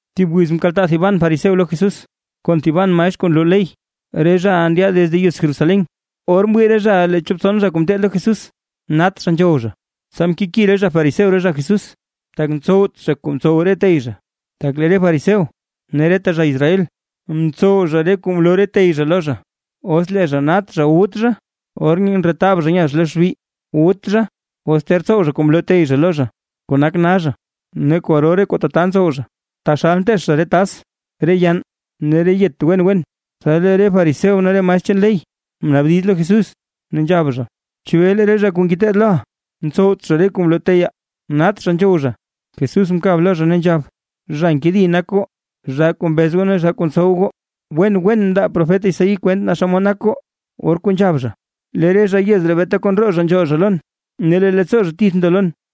Thib wiz mkaltaa thiban fariseo lo Jesús, kon thiban maestr kuu nloo ley, re zhaʼa ndyaad desde yez Jerusalén. Or mwii re zhaʼa lee chop tson zha kuu ngeteed lo Jesús, nat zha nzhow zha, tsa mkeki re fariseo re zha Jesús. Tak ntsowt zha kuu mtsow re tey zha. Tak lee re fariseo ne reta zha Israel ntsow zha re kuu mloo tey zha lo zha, os lee zha nat zha, wut zha. Or ndretab zha nya zha lo xbi, wut zha os ter tsow zha kuu mloo tey zha lo zha, kuu nak na zha, ne kwaro re kuu tata ntsow zha, taxal nteech zha re tas, re yann ne re yet wen wen. Tsa lee re fariseo ne re maestr chaan ley mnaabdiz lo Jesús, ne nzhab zha: ―¿Chebee lee re zha kuu ngeteed loʼa ntsowt zha re kuu mloo teyaa, nat zha nzhow zha? Jesús mkab lo zha, ne nzhab: ―¡Zha nkedi nak goo, zhaa kuu mbez ne zhaa kuu ntsow goo! Wen wen mndaa profet Isaí kwent naa xomod nak goo. Or kuu nzhab zha: Lee re zha yez ree beeta kon roo zha nzhool zha lon, ne lee leettsoo zha tith ndo lon.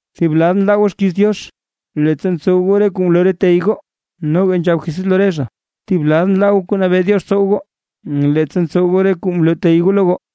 Thib lad nlaa goo xkiiz Diox, leettsa ntsow goo re kuu mloo re tey goo. Noga nzhab Jesús lo re zha: ―Thib lad nlaa goo kuu nabee Diox tsow goo, leettsa ntsow goo re kuu mloo tey goo lo goo.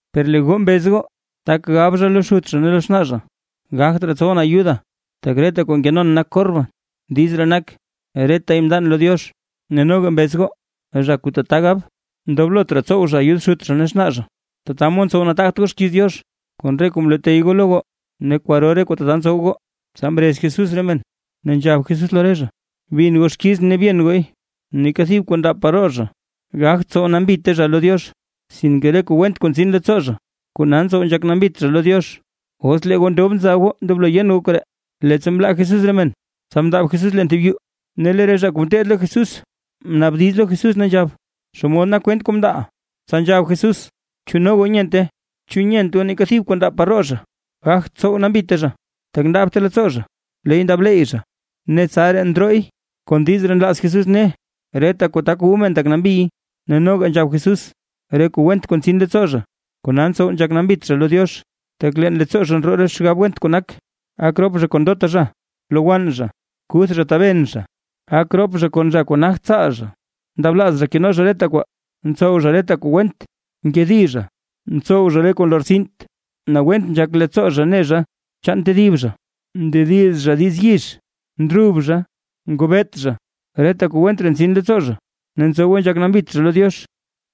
Per lee goo mbez goo: Tak gab zha lo xut zha ne lo xnaa zha: “Gagt raa tsowʼn ayuda, tak reta kuu nkenon nak korban”. (Diiz ree nak: “Retay mndan lo Diox”.) Ne noga mbez goo, zha kuu tata gab, ndoblot raa tsow zha ayud xut zha ne xnaa zha. Tata mod ntsow nataagt goo xkiiz Diox, kon re kuu mloo tey goo lo goo, ne kwaro re kuu tata ntsow goo. Tsa mrez Jesús re men, ne nzhab Jesús lo re zha: ―Bin goo xkizʼn ne byen gooy. Neeka thib kuu ndaab par roo zha, gagt tsow nambite zha lo Diox, sinke re kuu went kuu ntsin leettsoo zha, kona ntsow nzhak nambit zha lo Diox. ¡Os lee goo ndob nza goo ndoblo goo yen goo koree! Leettsa mlaa Jesús re men tsa mndaab Jesús leen thib yuu, ne lee re zha kuu ngeteed lo Jesús mnaabdiz lo Jesús, ne nzhab: ―Xomod nak kwent kuu mndaaʼa. Tsa nzhab Jesús: ―¿Chu no goo nyente? ¿Chu nyent goo neeka thib kuu ndaab par roo zha, gagt tsow nambite zha? Tak ndaabte leettsoo zha, leey ndaab leeyy zha, ne tsaraa ndrooy. Kon diiz ree nlaaz Jesús ne, reta kuu tak wu men tak nambiy. Ne noga nzhab Jesús: ―Re kuu went kuu ntsin leettsoo zha, kona ntsow nzhak nambit zha lo Diox. Tak leen leettsoo zha ndroo re xgab went kuu nak: Gak rop zha kon ndota zha, lowann zha, kuth zha taben zha, gak rop zha kon zha kuu nagt tsaal zha, ndablaaz zha keno zha reta kwaa, ntsow zha reta kuu went, nkedi zha, ntsow zha re kuu nlortsint, nawent nzhak leettsoo zha ne zha chaan tedib zha, ndediz zha diiz yix, ndrub zha, ngobeet zha. Reta kuu went ree ntsin leettsoo zha, ne ntsowe nzhak nambit zha lo Diox.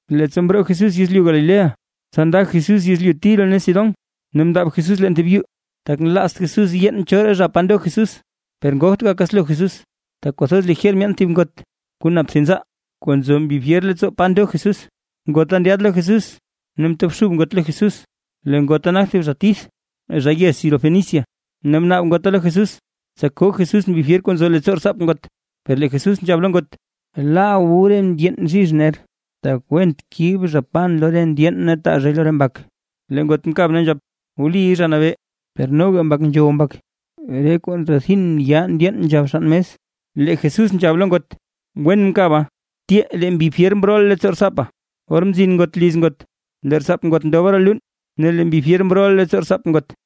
Leettsa mroo Jesús yezlyu Galilea, tsa nda Jesús yezlyu Tiro ne Sidón, ne mndaab Jesús leen thib yuu, tak nlaazt Jesús yeen choraa zha pa ndo Jesús. Per ngogt gakaslo Jesús, tak kwathoz lijer myeen thib ngot kuu nap thib nzaa, kuu nzo mbi fyer leettsoo pa ndo Jesús, ngota ndyaad lo Jesús ne mtobxub ngot lo Jesús. Lee ngota nak thib zha tith zha yez Sirofenicia, ne mnaab ngota lo Jesús, tsa koo Jesús mbi fyer kuu nzo leettsoo rtsaap ngot. Per lee Jesús nzhab lo ngot: ―Laa wu re ndyeen bzhizh ner, tak went kib zha pan lo re ndyeen ne taa zhay lo re mbak. Lee ngot mkab ne nzhab: ―Wliy, Zha Nabee, per noga mbak nzhow mbak re kuu kuu ndrethin ya ndyeen nzhab xann mes. Lee Jesús nzhab lo ngot: ―Wen mkaba, tyee lee mbi fyer mrooʼa leettsoo rtsaapa. Or mzin ngot liz ngot, lee rtsaap ngot ndoba roo luun, ne lee mbi fyer mrooʼa leettsoo rtsaap ngot.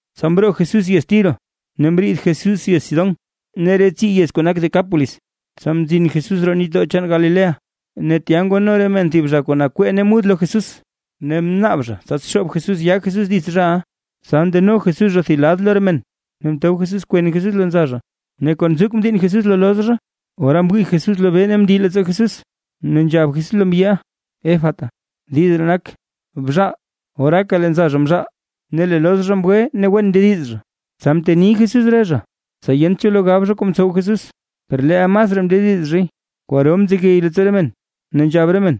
Tsa mroo Jesús yez Tiro ne mriid Jesús yez Sidón ne re tsii yez kuu nak Decápolis, tsa mzin Jesús roo nitdoo chaan Galilea. Ne tya ngwano re men thib zha kuu nakwee ne mud lo Jesús, ne mnaab zha, tsa xoob Jesús yaa Jesús dits zhaʼa. Tsa ndeno Jesús zha thib lad lo re men, ne mtob Jesús kwen Jesús leen nza zha, ne kon nzuk mdiinn Jesús lo loz zha. Ora mwii Jesús lobee ne mndii leettsoo Jesús, ne nzhab Jesús lo mbyiʼa: ―¡Efata! (Diiz ree nak: “¡Bxaal!”) Oraaka lee nza zha mzhaal, ne lee loz zha mgwe ne wen mndediz zha. Tsa mteni Jesús re zha, tsa yent cho lo gab zha kuu mtsow Jesús; per leel masraa mndediz zhay. Kwaro mzegey leettsoo re men, ne nzhab re men: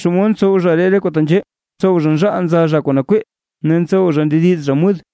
―¡Xomod ntsow zha ree re kuu tenzhee! ¡Ntsow zha nzhaal nza zha kuu nakwee, ne ntsow zha ndediz zha mud!